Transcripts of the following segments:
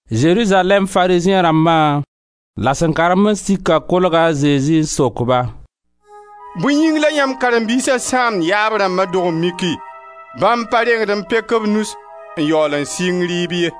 Zerizalɛɛm Farizẽ rãmbã la sẽn karen-ba-n-sikã kolga a Zezi n sok-ba: «Bõe yĩng la yãmb karen-biisa sãamd yaab rãmba dog-n-miki? Bãmb pa rengd n pek b nus n yaool n sɩng rɩɩb ye.»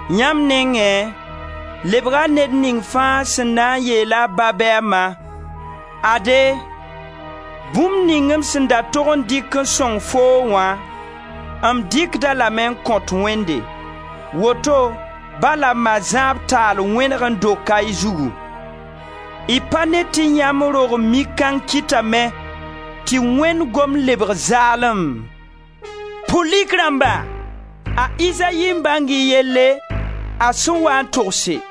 Yãmb nengẽ lebga ned ning fãa sẽn na n yeel a ba bɩ a ma: ‹Ade, bũmb ning m sẽn da tog n dɩk n sõng foo wã, m dɩkd-a lame n kõt Wẽnde.› Woto ba la ma zãab taal wẽneg n doka y zugu. Y pa ne tɩ yãmb dog-n-mik kãng kɩtame tɩ Wẽnd gomd lebg zaalem? Pʋlik rãmba! A Izayi n bãng y yelle a sẽn waa n togse: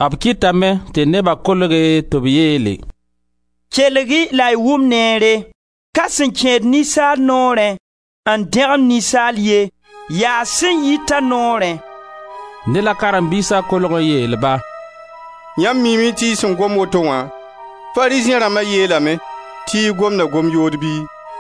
B kɩtame tɩ neba kolge tɩ b yeele: «Kelg-y la y wʋm neere! Ka sẽn kẽed ninsaal noorẽ, n dẽgemd ninsaal ye, yaa sẽn yit a noorẽ.» Dẽ la karen-biisa kolg n yeel-ba: «Yãmb miime tɩ y sẽn gom woto wã, Farizẽ rãmba yeelame tɩ y gomda gom-yood bɩ?»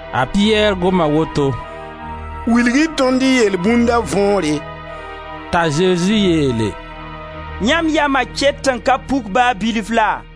A Piyɛr goma woto: «Wilg-y tõnd y yelbũnda võore.» T'a Zezi yeele: «Yãmb yama ket n ka puk ba bilfu la?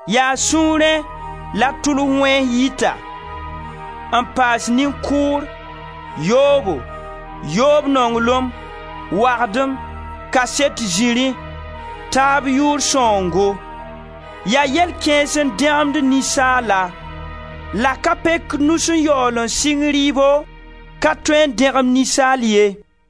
Yaa sũurẽ la tʋls wẽns yita, n paas nin-kʋʋr, yoobo, yoob nonglem, wagdem, kaset-zirẽ, taab yʋʋr sãoongo. Yaa yell kãens n dẽgemd ninsaala. La ka pek nus n yaool n sɩng rɩɩbo, ka tõe n dẽgem ninsaal ye.»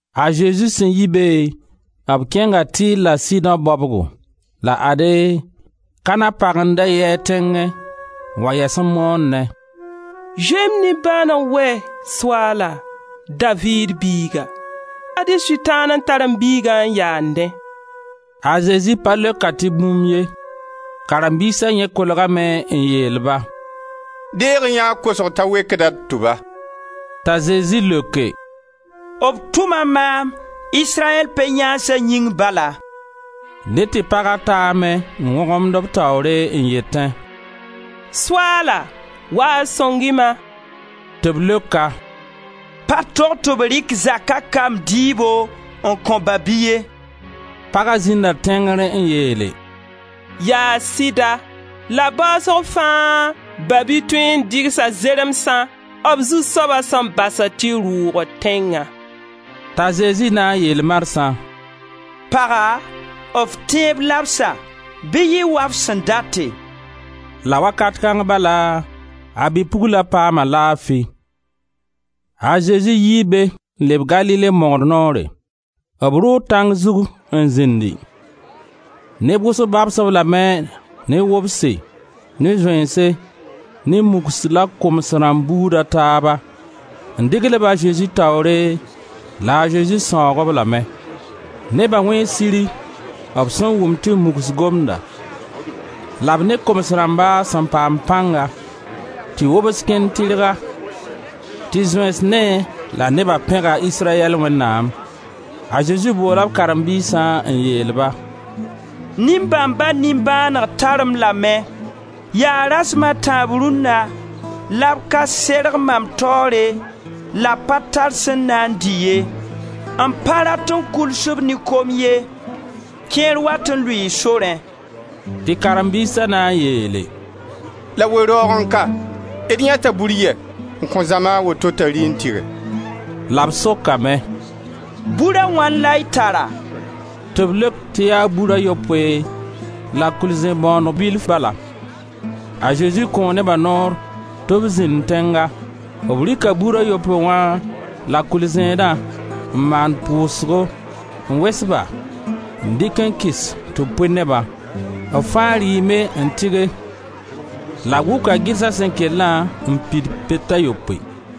A Zezi sẽn yi be, b kẽnga Tir la Sidõ baobgo. La ade, Kanaã pag n da yi a tẽngẽ n wa yɛs n moonẽ: «Zoe-y m nimbãaneg wɛ, Soaala, Daviid biiga! Ad-y Sʋtãan n tar m biiga n yaannẽ.» A Zezi pa leok-a tɩ bũmb ye. Karen-biisa yẽ kolgame n yeel-ba: «Deeg-y yã a kosg t'a wekda d tʋba.» T'a Zezi leoke: «B tʋma maam Israyɛl pe-yãansa yĩng bala.» Dẽ tɩ paga taame n wõgemd b taoore n yetẽ: «Soaala, wa-y n sõng-y-ma!» Tɩ b leok-a: «Pa tog tɩ b rɩk zaka kamb dɩɩbo n kõ ba-bi ye.» Paga zĩnda tẽngr n yeele: «Yaa sɩda, la baasg fãa ba-bi tõe n dɩgsa zeremsã b zu-soaba sẽn basd tɩ rʋʋgd tẽngã.» T'a Zezi na n yeel marsã: «Paga, f tẽeb labsa, bɩ yɩ wa f sẽn date.» La wakat kãng bala a bi-pugla paama laafi. A Zezi yii be n leb Galile mogr noore. B rʋʋ tãng zug n zĩndi. Neb wʋsg babs-b lame ne wobse, ne zoeense, ne mugs la koms rãmb buud a taaba, n dɩgl-ba a Zezi taoore la a Zezi sãoog-b lame. Neba wẽe siri b sẽn wʋm tɩ mugs gomda la b ne koms rãmba sẽn paam pãnga, tɩ wobs kẽnd tɩrga tɩ zoeens neẽ la neba pẽga Israyɛl Wẽnnaam. A Zezi boola b karen-biisã n yeel-ba: «Nin-bãmba nimbãaneg tar-m lame, yaa rasem a tãab rũnna la b ka serg mam taoore la b pa tar sẽn na n dɩ ye. M pa rat n kuls-b ne kom ye; kẽer wat n lʋɩɩ sorẽ.» Tɩ karen-biisa na n yeele: «La we-raoogẽ ka, d yãeta bur yɛ n kõ zãma a woto t'a rɩ n tɩge?» La b sokame: «Bur a wãn la y tara?» Tɩ b leok tɩ yaa bur a yopoe la kʋɩl-zẽ-bõoneg bilf bala. A Zezi kõo neba noor tɩ b zĩnd tẽnga. B rɩka bur a yopoe wã la kʋɩl-zẽedã, n maan pʋʋsgo, n wes-ba, n dɩk n kɩs tɩ b pʋɩ nebã. B fãa rɩɩme n tɩge la b wʋka gɩrsa sẽn kellã n pid pet a yopoe.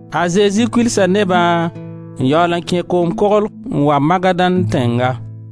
A Zezi kulsa nebã n yaool n kẽ koom koglg n wa Magadan tẽnga.